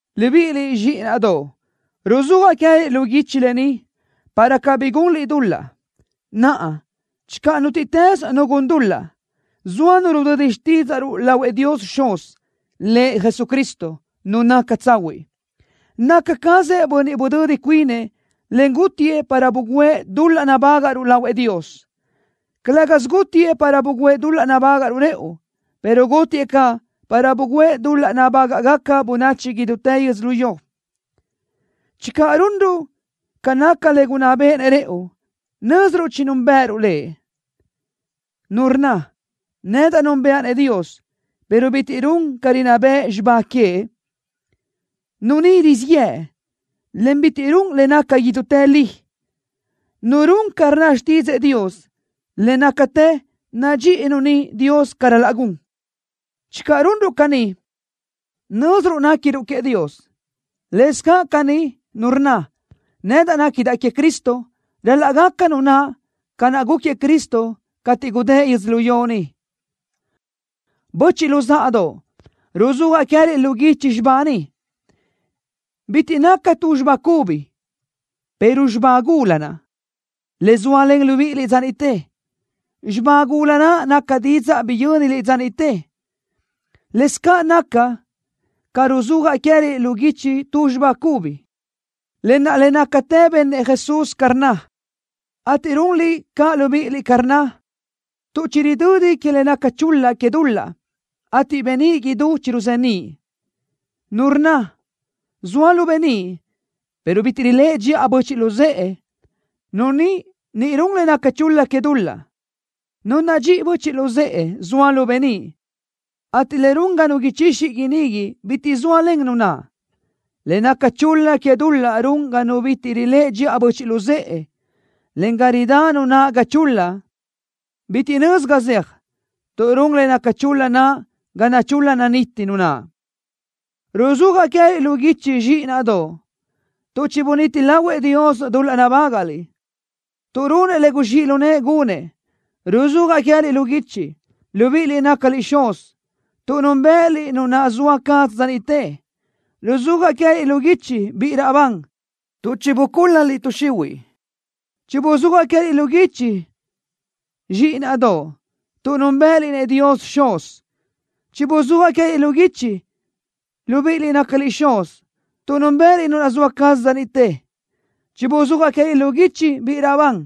Libíʼiliʼ, zxíʼinaʼdoʼ, ruzúajaʼ queë́liʼ lu guichi lë ni, para cabí gunliʼ dul-laʼ. Naʼa, channö nútiʼtës nu gun dul-laʼ, zoa nu rudödi xtídzaʼruʼ lahuëʼ Dios Xuz, Lëʼ Jesucristo, Nu naca tsahuiʼ. Naca cazëʼ Bönniʼ budödi cuinëʼ, en gútiëʼ para bugǘëʼ dul-laʼ nabágaʼruʼ lahuëʼ Dios. Calë́gasö gútiëʼ para bugǘëʼ dul-laʼ nabágaʼruʼ rëʼu, pero gútiëʼ caʼ para bugǘëʼ dul-laʼ nabágaʼgaca bönachi idútë yödzölió. Channö runruʼ ca naca le gunná béʼenëʼ rëʼu, nö́ziruʼ chinúnbëʼëruʼ Lëʼ. Nu rnna: “Nedaʼ núnbëʼa-nëʼ Dios” pero bitiʼ run ca rinná bëʼ xibá queëʼ, nu ni rizíʼ yëʼ, en bitiʼ run le naca idútë li. Nu run ca rnna xtídzëʼë Dios, le nácatë nadxíʼi nu ni Dios ca ral-laʼ gun. Channö runruʼ caní, nö́ziruʼ néquiruʼ queëʼ Dios. Lëscaʼ caní, nu rnna: “Nedaʼ néquidaʼ queëʼ Cristo”, ral-laʼ gaca nu naʼ ca naʼ gúquiëʼ Cristo cateʼ gudë́ʼ yödzölió ni. Böchiʼ luzáʼadoʼ, ruzúajaʼ queë́liʼ lu guichi xibá ni. Bitiʼ naca tu xibá cubi, pero xibá gula naʼ, le zóalen libíʼiliʼ dza niʼte. Xibá gula naʼ naca didzaʼ biyö́niliʼ dza niʼte. Lëscaʼ naca ca ruzúajaʼ queë́liʼ lu guichi tu xibá cubi, lë naʼ le nácatë benëʼ Jesús ca rnna, ateʼ runliʼ caʼ libíʼiliʼ ca rnna, tuʼ chiridödi que le naca chul-la que dul-laʼ, ateʼ beníʼ idú chiruzeníʼ. Nu rnna: “Zoaʼ lu beníʼ”, pero bitiʼ riléʼe dxiʼa böchiʼ luzë́ʼe, nu ni ni run le naca chul-la que dul-laʼ. Nu nadxíʼi böchiʼ luzë́ʼe zoa lu beníʼ, ateʼ le run ga nu ichixi inigui bitiʼ zóalen nu naʼ. Le naca chul-la que dul-laʼ run ga nu bitiʼ riléʼe dxiʼa böchiʼ luzë́ʼe, en ga ridá nu naʼ ga chul-la. Bitiʼ nözi ga zeaj, tuʼ run le naca chul-la naʼ ga nachul-la naniti nu naʼ. Ruzúajaʼ queë́liʼ lu guichi, zxíʼinaʼdoʼ, tuʼ chibunít lahuëʼ Dios dul-laʼ nabágaʼliʼ, tuʼ runëʼ le guzxíʼ lu nëʼë gunëʼ. Ruzúajaʼ queë́liʼ lu guichi, libíʼiliʼ nácaliʼ xuz, tuʼ núnbëʼëliʼ Nu naʼ zoa caz dza niʼte. Ruzúajaʼ queë́liʼ lu guichi, biʼi raʼbán, tuʼ chibucúl-laliʼ tuʼ xihuiʼ. Chibuzúajaʼ queë́liʼ lu guichi, zxíʼinaʼdoʼ, tuʼ núnbëʼëliʼ-nëʼ Dios Xuz. Chibuzúajaʼ queë́liʼ lu guichi, libíʼiliʼ nácaliʼ xuz, tuʼ núnbëʼëliʼ Nu naʼ zoa caz dza niʼte. Chibuzúajaʼ queë́liʼ lu guichi, biʼi raʼbán,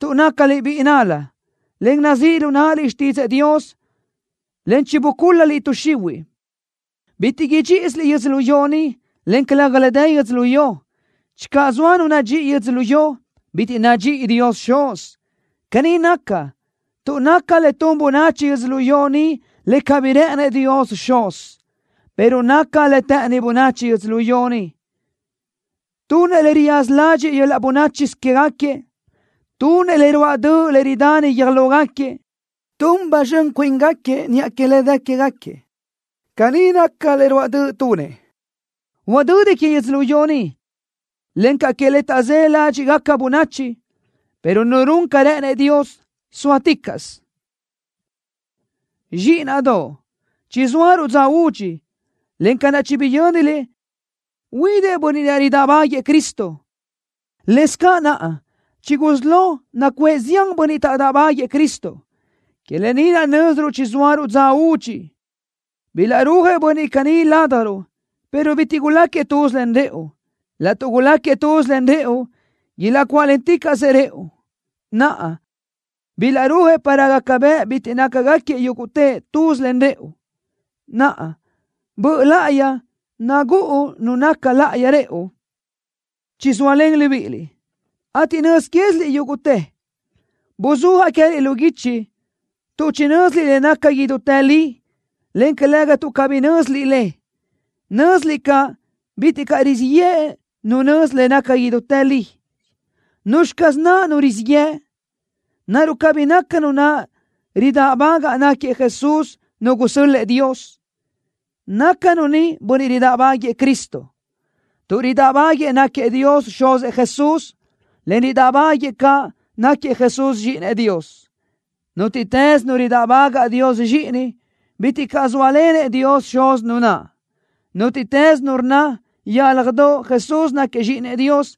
tuʼ nácaliʼ biʼi nál-la, en nazíʼ lu náʼaliʼ xtídzëʼë Dios, en chibucúl-laliʼ tuʼ xihuiʼ. Bitiʼ idxíʼisiliʼ yödzölió ni, en calëga le dë yödzölió ni. Channö zoa nu nadxíʼi yödzölió, bitiʼ nadxíʼi Dios Xuz. Caní naca, tuʼ naca le tun bönachi yödzölió ni le cabí rë́ʼënëʼ Dios Xuz, pero naca le të́ʼëni bönachi yödzölió ni. Tunëʼ le riyaza ladxiʼ yöl-laʼ bönáchisö quégaquiëʼ. Tunëʼ le ruáʼ döʼ le ridani guiö́j lógaquiëʼ. Tun ba zxön cuíngaquiëʼ niʼa que le dë quégaquiëʼ. Caní nácagaca le ruáʼ döʼ tunëʼ. Huadödi que yödzölió ni, encaʼ que le taʼzë́ ládxiʼgaca bönachi, pero nu run ca rë́ʼënëʼ Dios sóaticaʼsö. Zxíʼinaʼdoʼ, chizóaruʼ dza údxi, en ca naʼ chibiyö́niliʼ huidëʼ bönniʼ ridáʼbáguëʼë Cristo, lëscaʼ naʼa chigusí lo nacuʼë zián bönniʼ taʼdáʼbaguëʼë Cristo. Que lë ni naʼ nö́ziruʼ chizóaruʼ dza údxi. Bilaʼrúajëʼ bönniʼ caní ládjaruʼ, pero bitiʼ guláquiëʼ tuz len rëʼu. Laʼtuʼ guláquiëʼ tuz len rëʼu, ilaʼcuáʼlenticaʼsëʼ rëʼu. Naʼa, bilaʼrúajëʼ para gaca bëʼ bitiʼ nácagaquiëʼ yúguʼtëʼ tuz len rëʼu. Naʼa, Böʼ Láʼayi nagúʼu Nu naca láʼayi rëʼu, chizóalen libíʼiliʼ, ateʼ nöz quéziliʼ yúguʼtë. Buzúajaʼ queë́liʼ lu guichi, tuʼ chinö́ziliʼ le naca idútë li, en calëga tuʼ cabí nö́ziliʼ le. Nö́ziliʼ caʼ bitiʼ caʼ rizíʼ yëʼ nu nözi le naca idútë li. ¿Nuzxi caz naʼ nu rizíʼ yëʼ? ¿Naruʼ cabí naca nu naʼ ridáʼbagaʼ náquiëʼ Jesús Nu gusö́l-lëʼë Dios? Naca nu ni bönniʼ ridáʼbaguëʼë Cristo, tuʼ ridáʼbaguëʼë náquiëʼ Dios Xuzëʼ Jesús, en ridáʼbaguëʼë caʼ náquiëʼ Jesús Zxíʼinëʼ Dios. Nútiʼtës nu ridáʼbagaʼ Dios Zxíʼini, bitiʼ caʼ zóalenëʼ Dios Xuz nu naʼ. Nútiʼtës nu rnna yálajdoʼ Jesús náquiëʼ Zxíʼinëʼ Dios,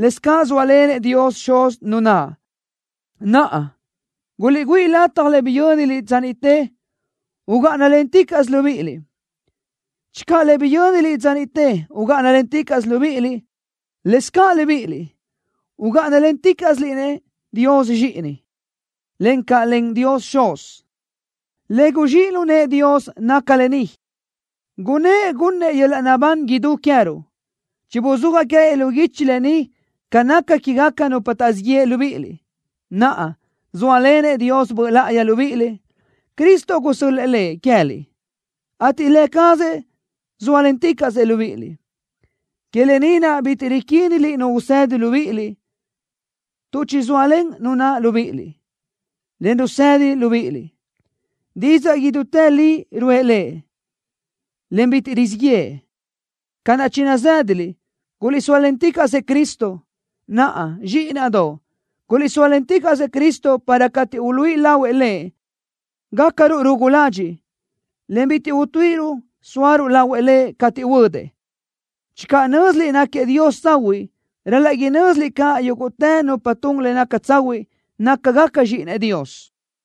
lëscaʼ zóalenëʼ Dios Xuz nu naʼ. Naʼa, guliʼgüíʼ lataj le biyö́niliʼ dza niʼte ugáʼanalenticaʼsö libíʼiliʼ. Channö le biyö́niliʼ dza niʼte ugáʼanalenticaʼsö libíʼiliʼ, lëscaʼ libíʼiliʼ ugáʼanalenticaʼsiliʼ-nëʼ Dios Zxíʼini, encaʼ len Dios Xuz. Le guzxíʼ lu nëʼë Dios naca lë ni: Gunnë́ʼ gunnëʼ yöl-laʼ naʼbán idú queë́ruʼ. Chibuzúajaʼ queë́liʼ lu guichi lë ni ca naca quégaca nupa taʼzíʼ yeʼe libíʼiliʼ. Naʼa, zóalenëʼ Dios Böʼ Láʼayi libíʼiliʼ. Cristo gusö́l-lëʼë Lëʼ queë́liʼ, ateʼ Lë cazëʼ zóalenticaʼsëʼ libíʼiliʼ. Que lë ni naʼ bitiʼ riquíniliʼ nu usedi libíʼiliʼ, tuʼ chizóalen Nu naʼ libíʼiliʼ, en rusedi libíʼiliʼ. Didzaʼ idútë li ruʼë Lëʼ, en bitiʼ rizíʼ yëʼë. Ca naʼ chinazë́daliʼ, guliʼsóalenticaʼsëʼ Cristo. Naʼa, zxíʼinaʼdoʼ, guliʼsóalenticaʼsëʼ Cristo para cateʼ uluíʼi lahuëʼ Lëʼ, gácaruʼ rugu ladxiʼ, en bitiʼ utuíʼiruʼ sóaruʼ lahuëʼ Lëʼ cateʼ huödëʼ. Channö nö́ziliʼ náquiëʼ Dios tsahuiʼ, ral-laʼ inö́ziliʼ caʼ yúguʼtë nupa tun le naca tsahuiʼ nácagaca zxíʼinëʼ Dios.